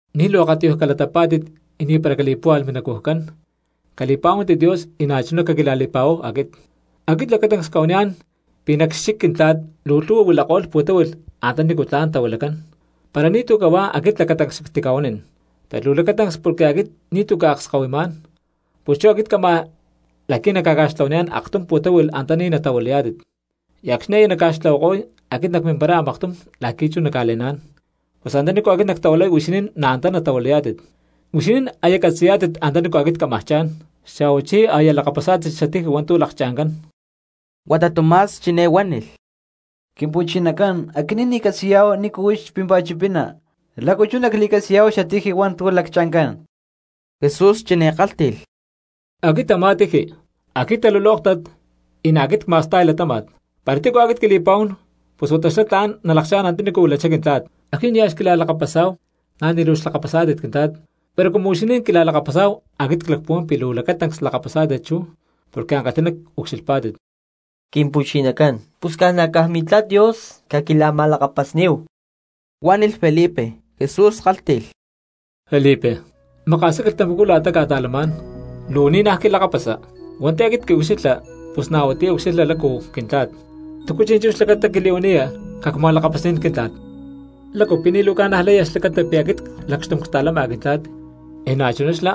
’Ni̠ luu akatiyuj calatapá̠tit y ni̠para cali̠púhualh minacujcán, cali̠pa̠huántit Dios y na̠chuná caquila̠li̠pa̠huáhu aquit. Aquit lacatancs cca̠huaniyá̠n pi̠ nac xchic Quintla̠t luu lhu̠hua huilako̠lh pu̠táhui̠lh antanícu tla̠n tahuilacán; para ni̠tu̠ cahuá aquit lacatancs xactica̠huanín. Pero luu lacatancs porque aquit ni̠tu̠ cca̠akskahuimá̠n, pus chú aquit cama la̠qui̠ nacca̠ca̠xtlahuaniyá̠n aktum pu̠táhui̠lh antaní natahuilayá̠tit. Y acxni̠ aya nacca̠xtlahuako̠y aquit nacmimparay a̠maktum la̠qui̠ chú nacca̠le̠ná̠n, pus antanícu aquit nactahuilay huixinín na̠ antá natahuilayá̠tit. Huixinín aya catzi̠yá̠tit antanícu aquit cámaj cha̠n, xa̠huachí aya lakapasá̠tit xatiji hua̠ntu̠ laccha̠ncán. Huata Tomás chiné huánilh: —Quimpu̠chinacán, aquinín ni̠ ccatzi̠yá̠hu nícu huix pímpa̠t chipina, ¿lácu chú nacli̠catzi̠yá̠hu xatiji hua̠ntu̠ laccha̠ncán? Jesús chiné kálhti̠lh: —Aquit a̠má tiji, aquit talulóktat, y na̠ aquit cma̠sta̠y latáma̠t. Para tícu aquit quili̠pa̠huán pus huata xlá tla̠n nalakchá̠n antaní huilachá Quintla̠t. Acxni̠ nia̠ xquila̠lakapasá̠hu na̠ ni̠ luu xlakapasá̠tit Quintla̠t, pero cumu huixinín quila̠lakapasá̠hu aquit clacpuhuán pi̠ luu lacatancs lakapasá̠tit chú porque ankalhi̠ná ucxilhpá̠tit. —Quimpu̠chinacán, pus ca̠na̠caj Mintla̠t Dios caquila̠ma̠lakapasní̠hu —huánilh Felipe. Jesús kálhti̠lh: —Felipe, maka̠sá quilhtamacú la̠ta cca̠ta̠lamá̠n. ¿Tu luu ni̠ naj quilakapasa? Hua̠nti̠ aquit quiucxilha pus na̠ huatiyá ucxilhma lácu Quintla̠t, ¿túcu chi̠nchú xlacata quili̠huaniya cacca̠ma̠lakapasní̠n Quintla̠t? ¿Lácu pi̠ ni̠ luu ca̠najlaya xlacata pi̠ aquit lacxtum cta̠lama Quintla̠t, y na̠chuná xlá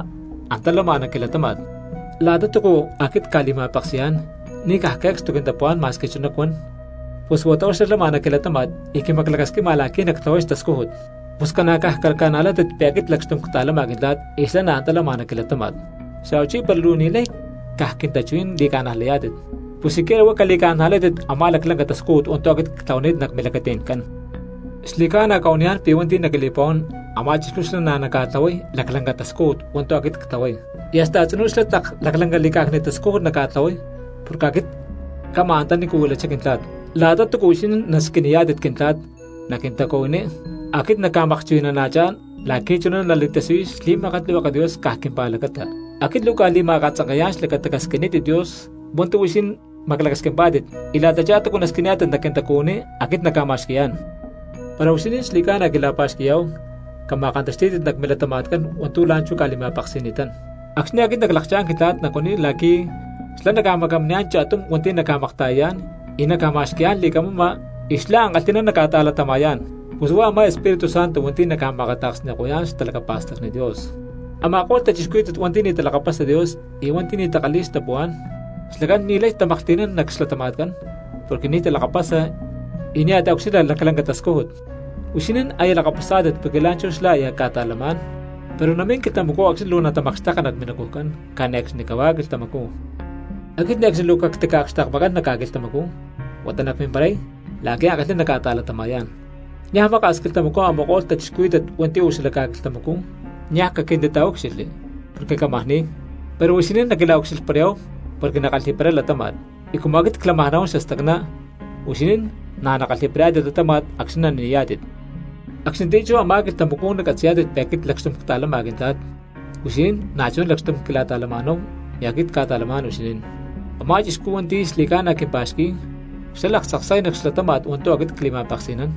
antá lama nac quilatáma̠t? La̠ta túcu aquit cca̠li̠ma̠peksi̠yá̠n ni̠ caj que̠cstu quintapuhuá̠n ma̠squi chuná cuan, pus huata huá xlá lama nac quilatáma̠t y quimaclacasquima la̠qui̠ nactlahuay xtascújut. Pus ca̠na̠ caj caca̠najlátit pi̠ aquit lacxtum ctá̠lama Quintla̠t y xlá na̠ antá lama nac quilatáma̠t, xa̠huachí para luu ni̠lay caj quintachuhuí̠n li̠ca̠najlayá̠tit, pus siquiera huá cali̠ca̠najlátit a̠má laclanca tascújut hua̠ntu̠ aquit cca̠tlahuani̠t nac milacati̠ncán. Xli̠ca̠na cca̠huaniyá̠n pi̠ hua̠nti̠ naquili̠pa̠huán a̠má chixcú xlá na̠ naca̠tlahuay laclanca tascújut hua̠ntu̠ aquit ctlahuay, y hasta a̠tzinú xlá tlak laclanca li̠cá̠cni̠t tascújut naca̠tlahuay porque aquit cama antaní huilachá Quintla̠t. La̠ta túcu huixinín nasquiniyá̠tit Quintla̠t nac quintacuhuiní aquit nacca̠makchuhui̠nana̠chá̠n la̠qui̠ chuná nali̠tasiyuy xli̠makatlihueke Dios caj quimpa̠lacata. Aquit luu cca̠li̠ma̠katzanke̠yá̠n xlacata casquinítit Dios hua̠ntu̠ huixinín maclacasquimpá̠tit y la̠tachá túcu nasquiniyá̠tit nac quintacuhuiní aquit nacca̠ma̠xqui̠yá̠n. ’Para huixinín xli̠ca̠na quila̠pa̠xqui̠yá̠hu cama̠kantaxtí̠tit nac milatama̠tcán hua̠ntu̠ la̠nchú cca̠li̠ma̠peksi̠ni̠tán. Acxni̠ aquit naclakchá̠n Quintla̠t nacuaniy la̠qui̠ xlá naca̠macaminiyá̠n cha̠tum hua̠nti̠ naca̠makta̠yayá̠n y naca̠ma̠xqui̠yá̠n li̠camama y xlá ankalhi̠ná naca̠ta̠latama̠yá̠n. Pus huá a̠má Espíritu Santo hua̠nti̠ naca̠ma̠akata̠ksni̠ko̠yá̠n xtalacapa̠stacni Dios. Ama̠ko̠lh cristianos hua̠nti̠ ni̠ talakapasa Dios y hua̠nti̠ ni̠ takalhi̠y xtapuhuá̠n, xlacán ni̠lay tamaklhti̠nán nac xlatama̠tcán porque ni̠ talakapasa y nia̠ taucxilha laclanca xtascújut. Huixinín aya lakapasá̠tit porque la̠nchú xlá aya ca̠ta̠lamá̠n, pero namín quilhtamacú acxni̠ luu natamakxteka nac minacujcán cane̠cxni cahuá quilhtamacú. ’Aquit ne̠cxni luu cactica̠akxtekmakán nac ca̠quilhtamacú, huata nacmimparay la̠qui̠ ankalhí̠n nacca̠ta̠latama̠yá̠n. Niaj maka̠s quilhtamacú a̠ma̠ko̠lh cristianos hua̠nti̠ uú xala ca̠quilhtamacú niaj caquintitaúcxilhli porque cámaj ni̠y, pero huixinín naquila̠ucxilhparayá̠hu porque nackalhi̠paray latáma̠t; y cumu aquit clámaj nahuán xastacná huixinín na̠ nakalhi̠parayá̠tit latáma̠t acxni̠ nani̠yá̠tit. Acxnitiyá chú a̠má quilhtamacú nacatzi̠yá̠tit pi̠ aquit lacxtum cta̠lama Quintla̠t, y huixinín na̠chuná lacxtum quila̠ta̠lama̠náhu y aquit cca̠ta̠lamá̠n huixinín. Amá cristiano hua̠nti̠ xli̠ca̠na quimpa̠xqui̠y xlá laktzaksay nac xlatáma̠t hua̠ntu̠ aquit cli̠ma̠peksi̠nán,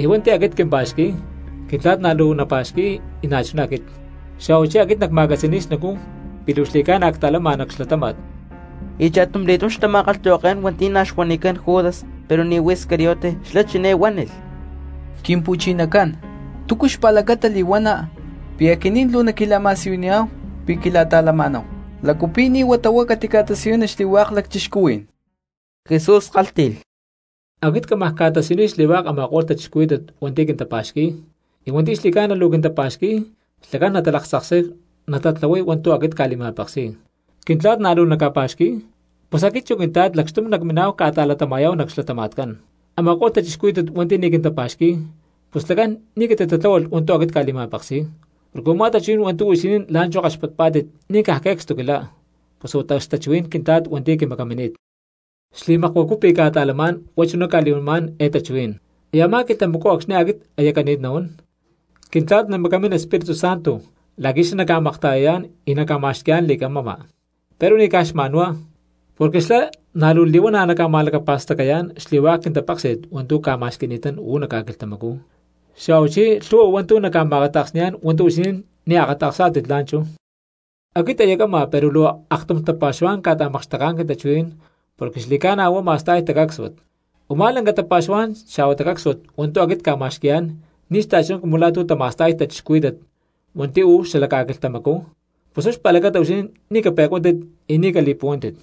y hua̠nti̠ aquit quimpa̠xqui̠y, Quintla̠t na̠ luu napa̠xqui̠y y na̠chuná aquit, xa̠huachí aquit nacma̠catzi̠ni̠y xnacú pi̠ luu xli̠ca̠na cta̠lama nac xlatáma̠t. Y cha̠tumli̠túm xtama̠kalhtahuaké̠n hua̠nti̠ na̠ xuanicán Judas pero ni̠ huá Iscariote, xlá chiné huánilh: —Quimpu̠chinacán, ¿túcu xpa̠lacata li̠huana pi̠ aquinín luu naquila̠ma̠siyuniyá̠hu pi̠ quila̠ta̠lama̠náhu? ¿Lácu pi̠ ni̠ huata huá catica̠tasiyuni xli̠hua̠k cristianos? Jesús kálhti̠lh: —Aquit cámaj ca̠tasiyuniy xli̠hua̠k a̠ma̠ko̠lh cristianos hua̠nti̠ quintapa̠xqui̠y, y hua̠nti̠ xli̠ca̠na luu quintapa̠xqui̠y xlacán natalaktzaksay natatlahuay hua̠ntu̠ aquit cca̠li̠ma̠peksi̠y, Quintla̠t na̠ luu naca̠pa̠xqui̠y, pus aquit chu Quintla̠t lacxtum nacminá̠hu ca̠ta̠latama̠yá̠hu nac xlatama̠tcán. Ama̠ko̠lh cristianos hua̠nti̠ ni̠ quintapa̠xqui̠y pus xlacán ni̠ catitatláhualh hua̠ntu̠ aquit cca̠li̠ma̠peksi̠y, porque u̠má tachuhuí̠n hua̠ntu̠ huixinín la̠nchú kaxpatpá̠tit ni̠ caj que̠cstu quilá, pus huata huá xtachuhuí̠n Quintla̠t hua̠nti̠ quimacamini̠t. ’Xli̠makuacú pi̠ ctica̠ta̠lamá̠n huá chuná cca̠li̠huanimá̠n eé tachuhuí̠n. Y a̠má quilhtamacú acxni̠ aquit aya cani̠t nahuán, Quintla̠t namacamín Espíritu Santo la̠qui̠ xlá naca̠makta̠yayá̠n y naca̠ma̠xqui̠yá̠n li̠camama; pero ni̠ caj xma̠nhuá, porque xlá na̠ luu li̠huana̠ naca̠ma̠lacapa̠stacayá̠n xli̠hua̠k quintapéksi̠t hua̠ntu̠ cca̠ma̠xqui̠ni̠tán uú nac ca̠quilhtamacú, xa̠huachí lhu̠hua hua̠ntu̠ naca̠ma̠kata̠ksni̠yá̠n hua̠ntu̠ huixinín ni̠ akata̠ksá̠tit la̠nchú. ’Aquit aya cama pero luu aktum tapa̠xuhuá̠n cca̠ta̠makxteká̠n quintachuhuí̠n porque xli̠ca̠na huá ma̠sta̠y tacácsuat; u̠má lanca tapa̠xuhuá̠n xa̠huá tacácsuat hua̠ntu̠ aquit cca̠ma̠xqui̠yá̠n ni̠ xta̠chuná cumu la̠ tu̠ tama̠sta̠y cristianos hua̠nti̠ uú xala ca̠quilhtamacú, pus huá xpa̠lacata huixinín ni̠ cape̠cuántit y ni̠ cali̠puhuántit.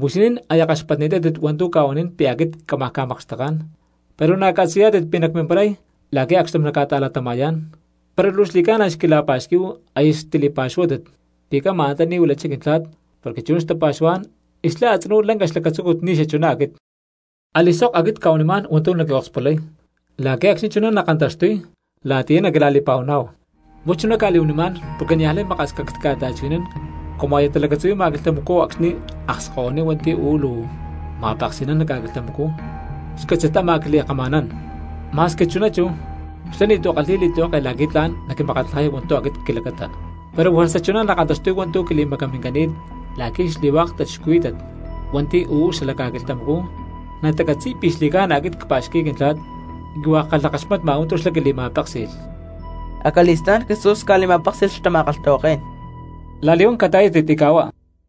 Huixinín aya kaxpatni̠tátit hua̠ntu̠ cca̠huanín pi̠ aquit camajá ca̠makxteká̠n pero na̠ catzi̠yá̠tit pi̠ nacmimparay la̠qui̠ acxtum nacca̠ta̠latama̠yá̠n; para luu xli̠cána xquila̠pa̠xquí̠hu aya xtili̠pa̠xuhuátit pi̠ cama antaní huilachá Quintla̠t porque chuná xtapa̠xuhuá̠n y xlá a̠tzinú lanca xlacatzúcut ni̠ xachuná aquit. Ali̠sok aquit cca̠huanimá̠n hua̠ntu̠ naquiokspulay la̠qui̠ acxni̠ chuná nakantaxtuy la̠tiyá naquila̠li̠pa̠huaná̠hu. ’Huá chuná cca̠li̠huanimá̠n porque niaj lay maka̠s cactica̠ta̠chuhui̠nán cumu aya talacatzuhui̠ma quilhtamacú acxni̠ akskahuiní hua̠nti̠ uú luu ma̠peksi̠nán nac ca̠quilhtamacú xcátzi̠t ámaj quili̠kama̠nán, ma̠squi chuná chú, xlá ni̠tu̠ kalhi̠y li̠tlihueke la̠qui̠ tla̠n naquimakatlajay hua̠ntu̠ aquit quilacata. Pero juerza chuná nakantaxtuy hua̠ntu̠ quili̠macamincani̠t la̠qui̠ xli̠hua̠k cristianos hua̠nti̠ uú xala ca̠quilhtamacú natacatzi̠y pi̠ xli̠ca̠na aquit cpa̠xqui̠y Quintla̠t y hua̠k ckalhakaxmatma hua̠ntu̠ xlá quintili̠ma̠péksi̠lh. Acali̠stá̠n Jesús ca̠li̠ma̠péksi̠lh xtama̠kalhtahuaké̠n: —La̠li̠huán cata̠yátit y ca̠huá.